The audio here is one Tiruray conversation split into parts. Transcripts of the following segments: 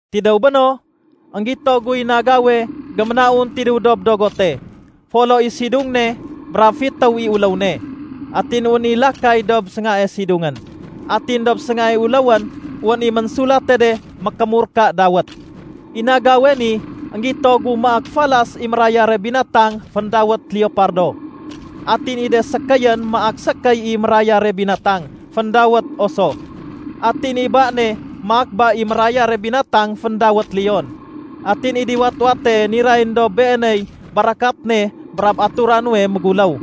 Tidéw béno, énggito guy nagawe géménaun tidéw dob dogote. Folo i sidung ne brab fitéw i uléw ne. Atin wén i lakay dob séngae sidungén. Atin dob séngae uléwén wén i ménsulate de mékémurka dawét. I nagawe ni énggito gu maak falas i mérayare binatang féndawét leopardo. Atin i de sékéyén maak sékéy i mérayare binatang féndawét oso. Atin i ba ne maak ba i mérayare binatang féndawét leon. Atin i diwat-wate nirayén dob beeney barakat ne brab atura nuwe méguléw.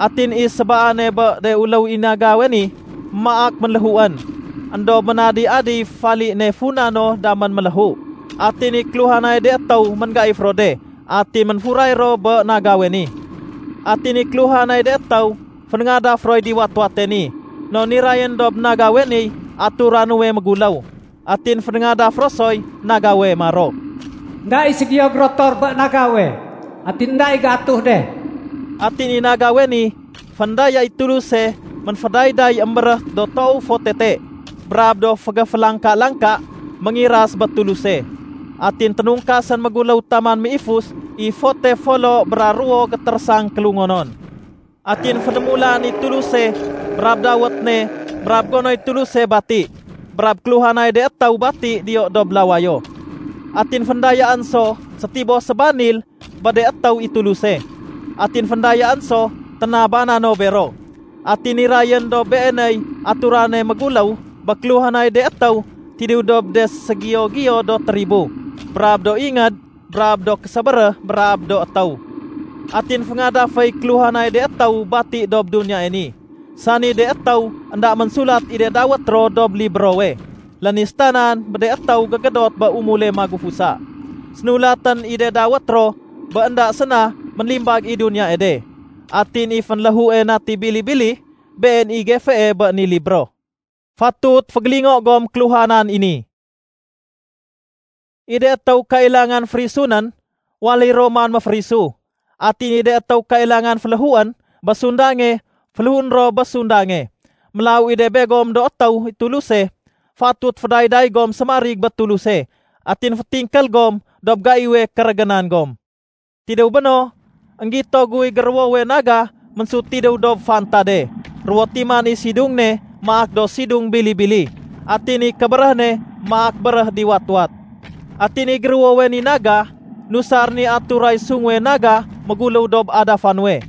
Atin i sébaane bé de uléw i nagawe ni maak ménléhuén, éndob ménadi-adiy fali ne funa no damén méléhu. Atin i kéluhanay de étéw ménggaif ro de atin ménfuray ro bé nagawe ni. Atin i kéluhanay de étéw fénéngadaf roy diwat-wate ni non nirayén dob nagawe niy atura nuwe méguléw. Atin fénéngadaf ro soy nagawe maro, “Enda i ségiyo gérotor bé nagawe. Atin énda i géatuh de.” Atin i nagawe ni, féndaya i Tuluse ménfédayday émbéréh do toow fo tete brab do fégéfélangka-langka, méngiras bé Tuluse. Atin ténungkasén méguléw taman méifus i fote folo bra ruwo gétérésang kélungonon. Atin fénémulaén i Tuluse brab dawét ne brab gonoy Tuluse bati brab kéluhanay de étéw bati diyo dob lawayo. Atin féndayaén so sétiboh sébanil bé de étéw i Tuluse, atin féndayaén so ténabana no bero. Atin nirayén dob beeney aturane méguléw bé kéluhanay de étéw tidéw dob de séségiyo-giyo do tribo brab do ingéd brab do késébéréh brab do étéw. Atin féngadaféy kéluhanay de étéw bati dob duniyae ni, sani de étéw énda ménsulat i de dawét ro dob librowe lénistanan bé de étéw gégédot bé umule magufusa. Sénulatén i de dawét ro bé énda séna ménlimbag i duniyae de. Atin i fénléhue Nati Bili-bili, Been i gefee bé ni libro. Fatut fégélingo gom kéluhanan i ni: I de étéw kailangan férisunén, waléy ro man méférisu. Atin i de étéw kailangan féléhuén bé sundange, féléhuén ro bé sundange. Mélaw i de begom do étéw i Tuluse, fatut fédayday gom sémarig bé Tuluse atin fétingkél gom dob gaiwe kérégénan gom. Tidéw béno, énggito guy géruwowe naga ménsut tidéw dob fantade. Ruwo timan i sidung ne maak do sidung bili-bili atin i kébéréh ne maak béréh diwat-wat. Atin i géruwowe ni naga, nusarén i aturay sunguwe naga méguléw dob adafa nuwe.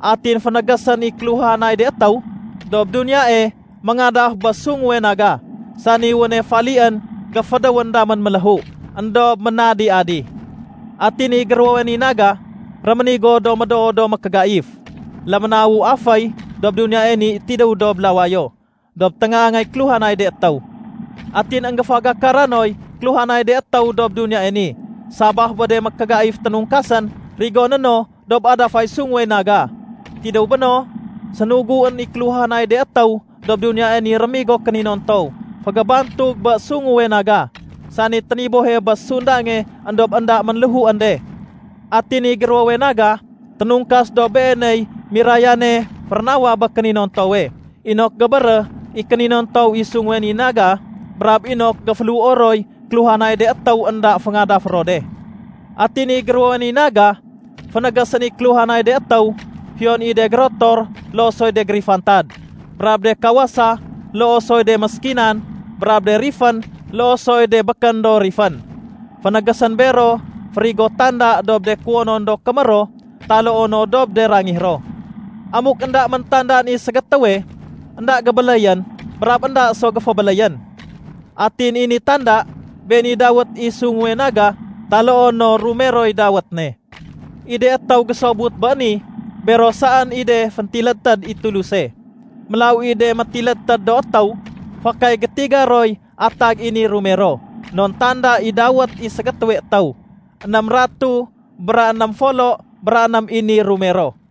Atin fénégésén i kéluhanay de étéw dob duniyae méngadaf bé sunguwe naga, sani wéne falién géfédéwén damén méléhu éndob ménadi-adi. Atin i géruwowe ni naga, réménigo do médoo do mékégaif. Léménawu aféy dob duniyae ni tidéw dob lawayo dob téngaangay kéluhanay de étéw. Atin énggéfégakara noy kéluhanay de étéw dob duniyae ni sabaf bé de mékégaif ténungkasén rigoné no dob adafay sunguwe naga. Tidéw béno, sénuguén i kéluhanay de étéw dob duniyae ni rémigo kéninontow fégébantug bé sunguwe naga, sani ténibohe bé sundange éndob énda ménléhuén de. Atin i géruwowe naga, ténungkas dob beeney mirayane férénawa bé kéninontowe inok gébéréh i kéninontow i sunguwe ni naga brab inok géféléhuo roy kéluhanay de étéw énda féngadafé ro de. Atin i géruwowe ni naga, fénégésén i kéluhanay de étéw, fiyon i de gérotor loo soy de gérifantad, brab de kawasa loo soy de méskinan, brab de rifén loo soy de békén do rifén, fénégésén bero férigo tanda dob de kuwonon do kémér ro taloo no dob de rangih ro. Amuk énda méntandaan i ségétéwe, énda gébéléyén brab énda so géfébéléyén. Atin i ni tanda, been i dawét i sunguwe naga taloo no rumeroy dawét ne. I de étéw gésobut bé ni, bero saén i de féntilédtéd i Tuluse. Mélaw i de métilédtéd do étéw, fakay gétiga roy atag i ni rumero non tanda i dawét i ségétéwe étéw. Ném ratuh bra ném folo bra ném i ni rumero.